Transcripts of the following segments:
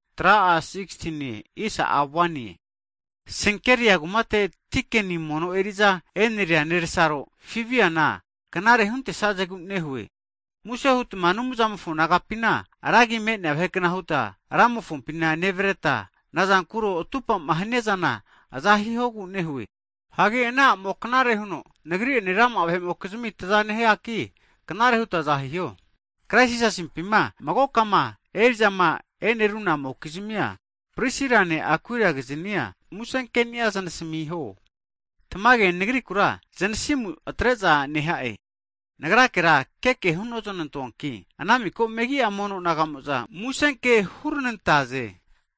Hagi Senkeria kumateti dikeni mono eri'za e'neria nersaro Fibina knare'za huntesazegu nehue. Muse hutma Anumzamofo naga'pina ragi me'nea vahekna huta Ramofompina nevareta, nazankuro atupama haniazana aza hihogu nehue. Hagi ana a'mo knare huno nagri'ene rama'a vahe'mokizmi taza nehia aki, knare huta aza hiho. Krais Jisasimpima magokama eri'zama e'nerunamokiznia Prisirane Akuilakizania muse keni'a znasamiho. Tamage nagu'vazikura zanasimu atresna'aza neha'e, nagrakera keke hunoznantoanki, ana miko megi'a mono naga'mo'za musenke huznantaze.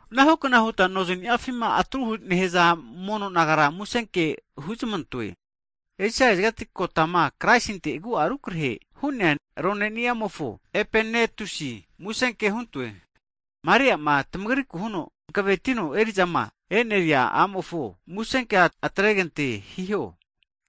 Anahukna huta nozniafima atru nehaza mono nagara musenke huzamantoe. Esia kazigati, kotama Kraisinte agu'a rukrahe hu'nea roneniamofo, Epenetusi musenke huntoe. Hagi Maria'a tamagriku huno hanavetino eri'zama eneria a'mofona musenke hugantene hutma asamiho.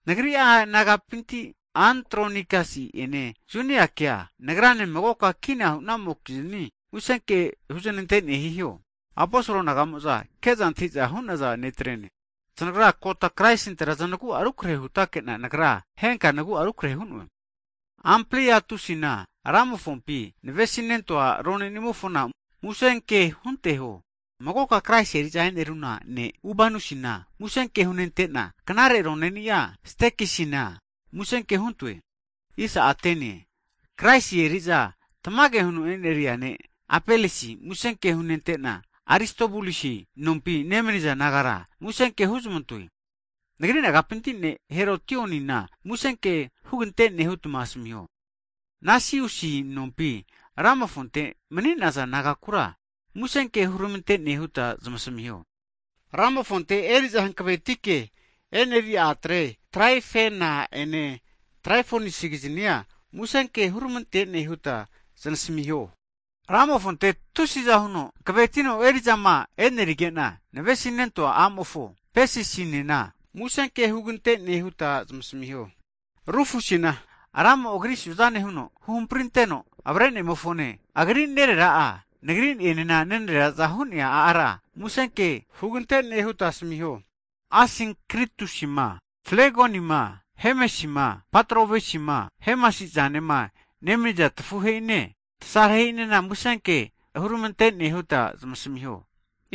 Nagri'a nagapinti Antronikasi ene Juniake, nagrane magoka kina hu'namokizni musenke huznantene hiho. Aposol naga'mo'za zanage'za antahiza hu'naza netrene. Zanagra kota Kraisintera zanagu'a rukrehe hutake'na, nagra henka nagu'a rukrehe hu'noe. Ampliatusina, Ramofompi navesinentua ronenimofona musenke hunteho. Magoka Kraisi eri'za e'neruna ne' Ubanusina musenke hunentena, knare roneni'a Stakisina musenke huntoe. Kraisi eri'za tamage huno eneria ne' Apelesina musenke hunentena, Aristobulusi nompi nemaniza nagara, musenkea huzmantoe. Nagri nagapinti ne' Herotionina musenke hugante'ne hutma asamiho. Nasisusi nompi, Ramofonte mani'naza nagakura musenke huramante huta zmasamiho. Ramofonte eri'za hanavetike eneri'a atre Traifena ene Traifosakigiznia musenke huranantene huta znasamiho. Ramofonte tusi'za huno hanavetino eri'zama enerige'na navesinento'a a'mofo Pesisinena musenke hugante'ne huta asamiho. Rufusina Ramo, Agri'a suzane huno huhamprinteno avrenemofone, agri nerera'a nagri'enena nenareraza hu'nea ara musenke hugante'ne huta asamiho. Asinkritusima, Flegonima, Hemesima, Patrovasima, Hemasi'zanema nemaniza tafuhe'ine, tasarahehe'ina musenke huramantene huta zmasamiho.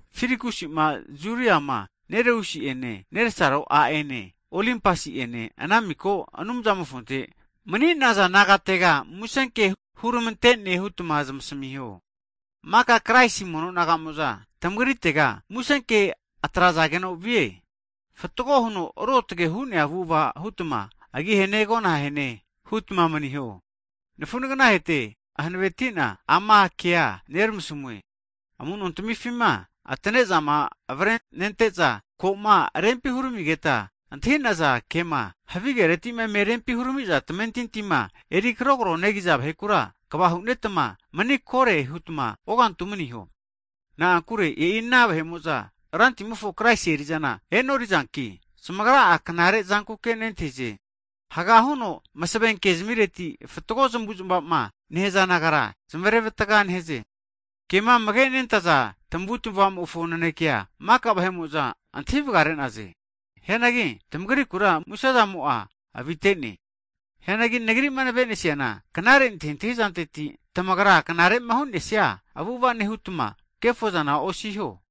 Filologusima, Juriama, Nereusi ene nesaro a'ene, Olimpasi'ene, ana miko Anumzamofonte mani'naza nagatega musenke huramante'ne hutma zmasamiho. Maka Kraisi mono naga'mo'za tamagritega musenke atrazageno vie. Fatgo huno ruotge hu'nea avu'ava hutma agi hene, agona ahene hutma maniho. Hagi nafu nagnahete, hankavetina ama kea neramasamue, Amu'nontamifima atane'zama avrenente'za, koma rempi huramigeta antahi'naza ke'ma, havigeretima eme rempi huramiza tamentintima eri kragogo negiza vahekura, kva hunetma mani kore hutma ogantu'a maniho. Na'ankure e'i ana vahe'mo'za Rantimofo Kraisi eri'zana e'norizanki, zamagra'a knare zankuke nentahize. Haga huno masave ke zamireti, fatgo zamavu'zmava'ma nehaza nagara zamarevatga nehaze. Kema amage nentaza tamavutmavamofo nanekea maka vahe'mo'za antahi vagare'naze. Hianagi tmagrikura musezanimo'a avite'ne. Hianagi nagri'ma navenesiana, knare antahintahi zanteti tamagra knare'ma hu'nesia avu'ava nehutma kefozana osiho.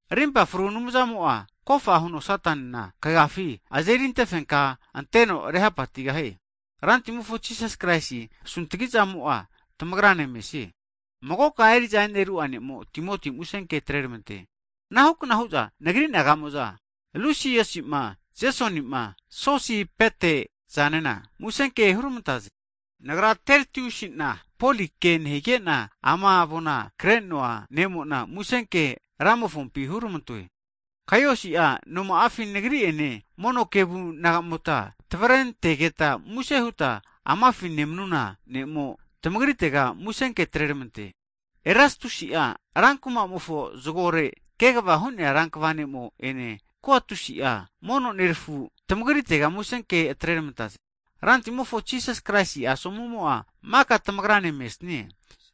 Arimpa fru Anumzamo'a kofa huno Satana, kagafi azeri antefenka anteno rehapatigahie. Rantimofo Jisas Kraisi asuntgizamo'a tamagrane mesie. Magoka eri'za eneru'a ne'mo Timoti'a musenke atreramante. Anahukna hu'za nagri naga'mo'za, Lusiusima, Jesonima Sosipeta'zanena musenke hurmantaze. Nagra Tertiusi'na, Poli'a kea nehige'na ama avoma kre'noa ne'mo'na musenkea Ramofo agifi hurmantoe. Kaiusi'a noma'afi nagri ene mono kevu nagamota tavrentegeta muse huta amafi nemnuna ne'mo, tamagritega musenke atreramante. Erastusi'a rankumamofo zagore kegava hu'nea rankva ne'mo'ene Kuatusi'a, mono nerafu, tmagritega musenke atrermantaze. [Rantimofo Jisas Kraisi asomumo maka tamagrane mesnie.]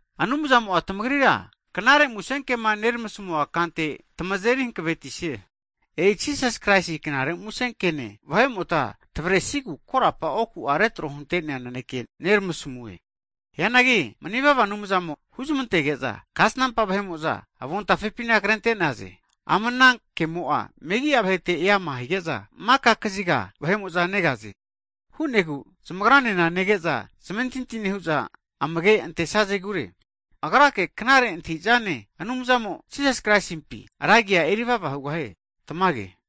Anumzamo'a tamagrira knare musenkema neramasamua kante tamazeri hankavetise. E'i Jisas Kraisi Knare Musenkene, vahe'mota tmavresigu korapa oku'a retro hunte'nea naneke neramasamue. Hianagi manivava Anumzamo huzamantege'za, kasnampa vahe'mo'za avontafepina krente'naze. Ama ana kemo'a megi'a vahete eama hige'za, maka kaziga vahe'mo'za negaze. Hu'negu zamagranena nege'za zamentinti nehu'za amage antesazegure. Agrake, knare antahi'zane Anumzamo'a, Jisas Kraisimpi, ra agi'a erivava hugahie. Tamage.